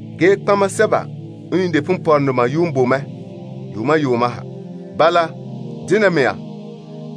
Ge nɔtɔgɔheba sɛba n yuun de ponpɔrɔŋdoma yuun boe mɛ yuuma yuuma ha. Bala, dena mea,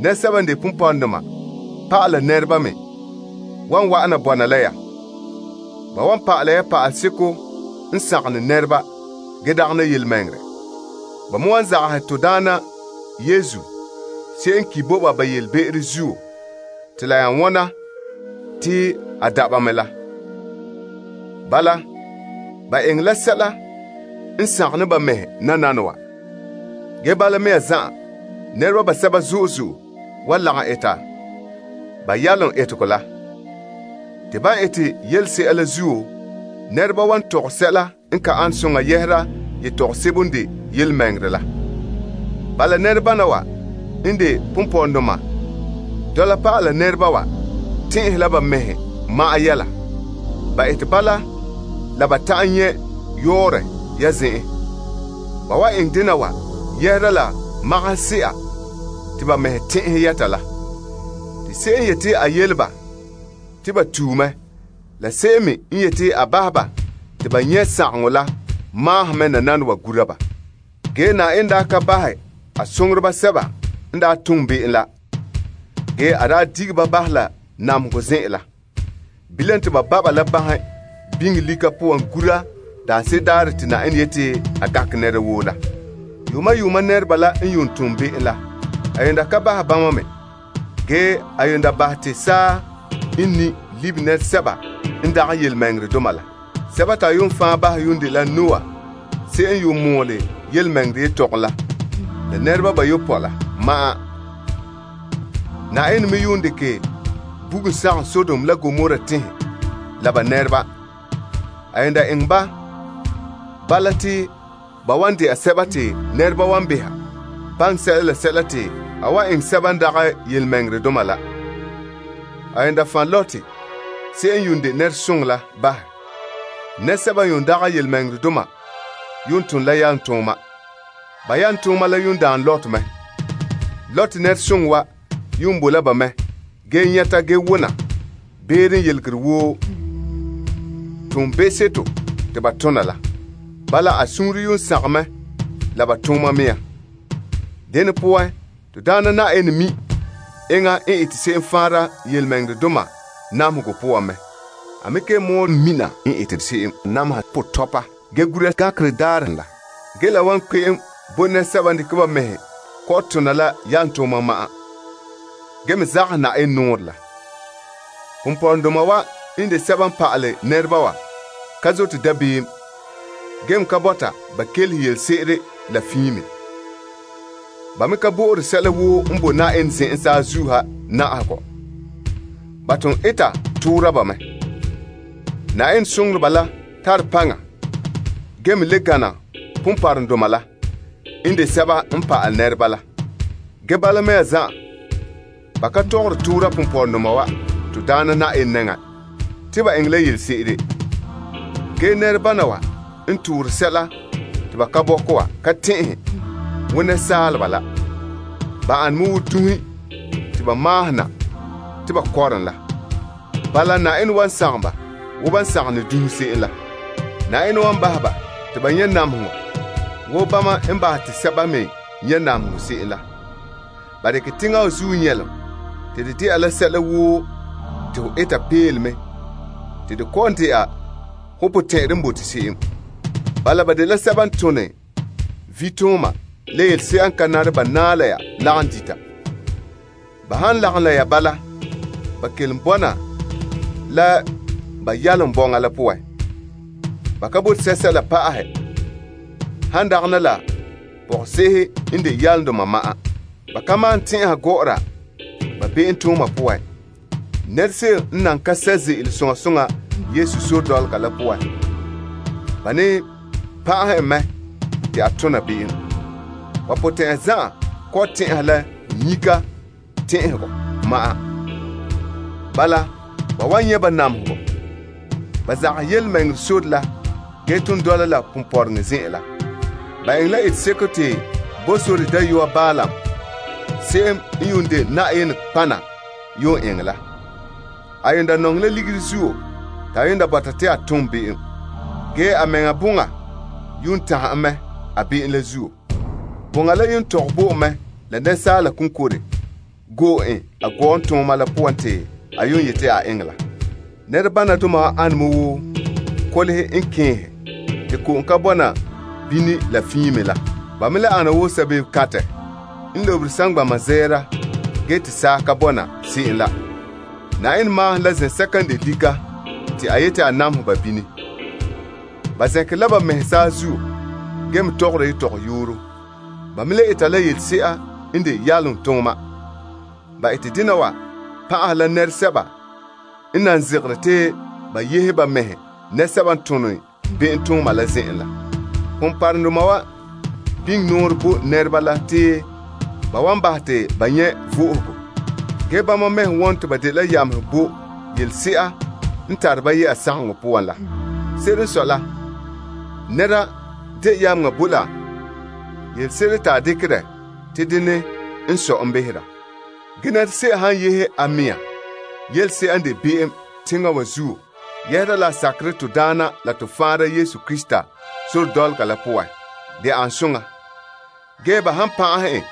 nɛresɛba n de ponpɔrɔŋdoma pa'ala nɛreba me wan wa'an bɔna la ya. Ba wan pa'ala ya pa'aleseko n sagom ne nɛreba ge dagana yelemɛŋɛrɛ. Ba me wan zagahɛ to Daana Yesu se'em n ki' bo ba ba yelebe'ero zuo te la nya wona te a da' ba mɛ la. Bala, ba eŋɛ la sɛla n sagom ne ba mɛhe nananawa. Ge bala mea zan'an, nɛreba basɛba zo'e zo'e wan lagom eta ponpɔrɔŋdoma la yalomtooma la. Te ban ete yelese'a la zuo, nɛreba wan tɔgɛ sɛla n ka ane soŋa yɛhera yetɔgom sebo n de yelemɛŋɛrɛ la. Bala, ponpɔrɔŋdoma wa tɛn'ɛhe la ba mɛhe ma'an yɛla. Ba ete bala la ba ta'an nyɛ' yɔɔrɔ ya zen'en. Ba wan eŋɛ dena wa yɛhera la sɔlema se'a te ba mɛhe tɛn'ɛhɛ yɛta la. Te se'em n yete a yele ba te ba tue mɛ la se'em n me yete a bahɛ ba te ba nyɛ' sagaŋɔ la ka ginhere. Ge Na'ayenɛ daa ka bahɛ a soŋoreba sɛba n daa tom be'em la. Ge a daa dige ba bahɛ la namehegɔ zen'an la. Bilam, te ba ba' ba la banhe biŋe lika poan gura daanse'ere daarɛ te Na'ayenɛ yete a gankɛ nɛra woo la. Yuuma yuuma nɛreba la n yuun tom be'em la, a yuun da ka bahɛ bama me. Ge a yuun da bahɛ te saa n ni' libe nɛresɛba n yuun ka zote Yenɛ. Sɛba te a yuun fan' bahɛ yuun dela Noah se'em n yuun mɔɔle yelemɛŋɛrɛ yetɔgom la la nɛreba bayopɔe la ma'an. Na'ayenɛ me yuun dekɛ bugum sagom Sodom la Gomora teŋhe la ba nɛreba. A yuun daa eŋɛ ba, bala te ba wan dɛna sɛba te nɛreba wan behɛ baŋɛ sɛla la sɛla te a wan eŋɛ sɛba n ka zote Yenɛ. A yuun fan' Lot se'em n yuun de nɛresoŋɔ la bahɛ. Nɛresɛba n yuun ka zote Yenɛ la yuun tone la yalomtooma. Ba yalomtooma la yuun daan Lot me. Lot nɛresoŋɔ wa yuun bo la ba mɛ ge nyɛta ge wona beere n yelegere woo toonbe'seto te ba tona la. Bala, a suunre yuun sagom mɛ la ba tooma mea. Dene poan, to Daana Na'ayenɛ mi' enŋa n ete se'em faanra yelemɛŋɛrɛdoma namehegɔ poan mɛ. A me kelom mina n ete se'em nameha potɔpa ge gura gankerɛ daarɛ la. Ge la wan kpe'em bo nɛresɛba n dekɛ ba mɛhe kɔ'ɔn tona la yalomtooma ma'an, ge me zagahɛ Na'ayenɛ nɔɔrɛ la. Ponpɔrɔŋdoma wa n de sɛba n pa'ale nɛreba wa ka zote dabeem gee me ka bɔta ba kelehe yelese'ere la fiin me. Ba me ka bo'ore sɛla woo n boe Na'ayenɛ zen'en saazuo ha na'ahegɔ. Ba ton eta toora ba mɛ. Na'ayenɛ soŋoreba la tare paŋa ge me le gana ponpɔrɔŋdoma la n de sɛba n pa'ale nɛreba la. Ge bala mea zan'an, ba ka tɔgɔre toora ponpɔrɔŋdoma wa to Daana Na'ayenɛ nɛŋa te ba eŋɛ la yelese'ere. Ge nɛrebana wa n toore sɛla te ba ka bɔkɛ wa ka tɛn'ɛhe wo saaleba la. Ba ane me wo dunhe te ba maahom na te ba kɔrom la. Bala, Na'ayenɛ wan sagom ba wo ban sagom ne dunhe se'em la. Na'ayenɛ wan bahɛ ba te ba nyɛ' namehegɔ wo bama n bahɛ te sɛba me nyɛ' namehegɔ se'em la. Ba dekɛ teŋa wa zuo nyɛlom te de dela sɛla woo te ho eta peelome te de kɔ'ɔn dɛna ho potɛn'ɛrɛ n bote se'em. Bala ba dela sɛba n tone vitooma la yelese'a n ka nare ba naɛ la ya lagom dita. Ba han lagom la ya bala, ba kelom bɔna la ba yalom bɔŋa la poan. Ba ka bote sɛla pa'ahɛ han dagana la pɔgɔse'ehe n de yalomdoma ma'an. Ba ka malom tɛn'ɛha gɔ'ɔra be'emtooma poan. Nɛra se'em n nan ka sɛ' ze'ele soŋa soŋa Yesu sore la poan, ba ne pan'ahɛ en mɛ te a tona be'em. Ba potɛn'ya zan'an kɔ'ɔn tɛn'ɛha la nyika tɛn'ɛhegɔ ma'an. Bala, ba wan nyɛ' ba namehegɔ. Ba zagahɛ yelemɛŋɛrɛ sore la ge ton dɔla la ponpɔrɔŋɔ zen'an la. Ba eŋɛ la eteseko te Bosore dayɔa Balaam se'em n yuun de Na'ayenɛ nɔtɔgɔha yuun eŋɛ la. A yuun da nɔŋɛ la ligiri zuo te a yuun da bɔta ta a tom be'em. Ge a mɛŋa boŋa yuun tanhɛ en mɛ a be'em la zuo. Boŋa la yuun tɔgɛ bo en mɛ la asaala konkore go'e en a gɔɔntooma la poan te a yuun yeti a eŋɛ la. Nɛrebanadoma wa ane me wo kolehe n kɛɛnhe te ko'om ka bɔna bini la fiin me la. Ba me le ana wo sabebekantɛ n lobere saŋgbana zɛɛra, ge te saa ka bɔna se'em la. Na'ayenɛ maahom la zen'sɛka n de lika te a yeti a namehɛ ba bini. Ba zɛnkere la ba mɛhe saazuo, ge me tɔgɔra yetɔgɔyooro. Ba me le eta la yelese'a n de yalomtooma. Ba ete dena wa pan'aha la nɛresɛba n nan zegere te ba yehe ba mɛhe nɛresɛba n tone be'emtooma la zen'en la. Ponpɔrɔŋdoma wa biŋe nɔɔrɛ bo nɛreba la te ba wan bahɛ te ba nyɛ' vo'ohogo. Ge bama mɛhe wone te ba dela yamehe bo yelese'a n tare ba yɛ'a sagaŋɔ poan la. Se'ere n sɔe la, nɛra de yameŋa bo la yelese'ere te a dekɛ dɛ te dene n sɔe en behera. Ge nɛra se'em han yehe a mɛŋa yelese'a n de be'em teŋa wa zuo yɛhera la a sakerɛ to Daana la to Faanra Yesu Krista sore dɔlɔga la poan, de an soŋa. Ge ba han pan'ahɛ en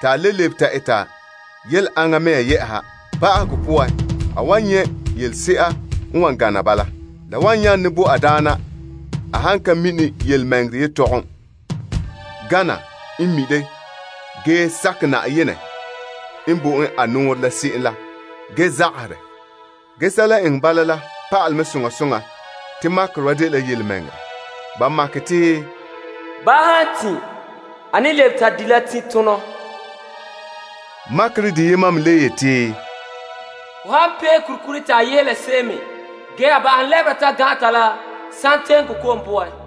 te a le lebe ta eta yele aŋa mea yɛ'ɛha, ba'ahegɔ poan, a wan nyɛ' yelese'a n wan gana bala. La wan yaane bo a daana a han ka mini yelemɛŋɛrɛ yetɔgom gana n mi' de ge sakɛ Na'ayenɛ n bo en a nɔɔrɛ la se'em la ge zagahɛ dɛ. Ge sɛla n eŋɛ ba la pa'alɛ mɛ soŋa soŋa te makerɛ wa dela yelemɛŋɛrɛ. Ba makɛ te, Wo baa n lebe ta di ka tiinro. Makerɛ deyema me le yeti, Ho han pee kurikuri te a yehe la se'em me ge a ba'ahom lɛbera ta gan'an ta la santeko ko'om poan.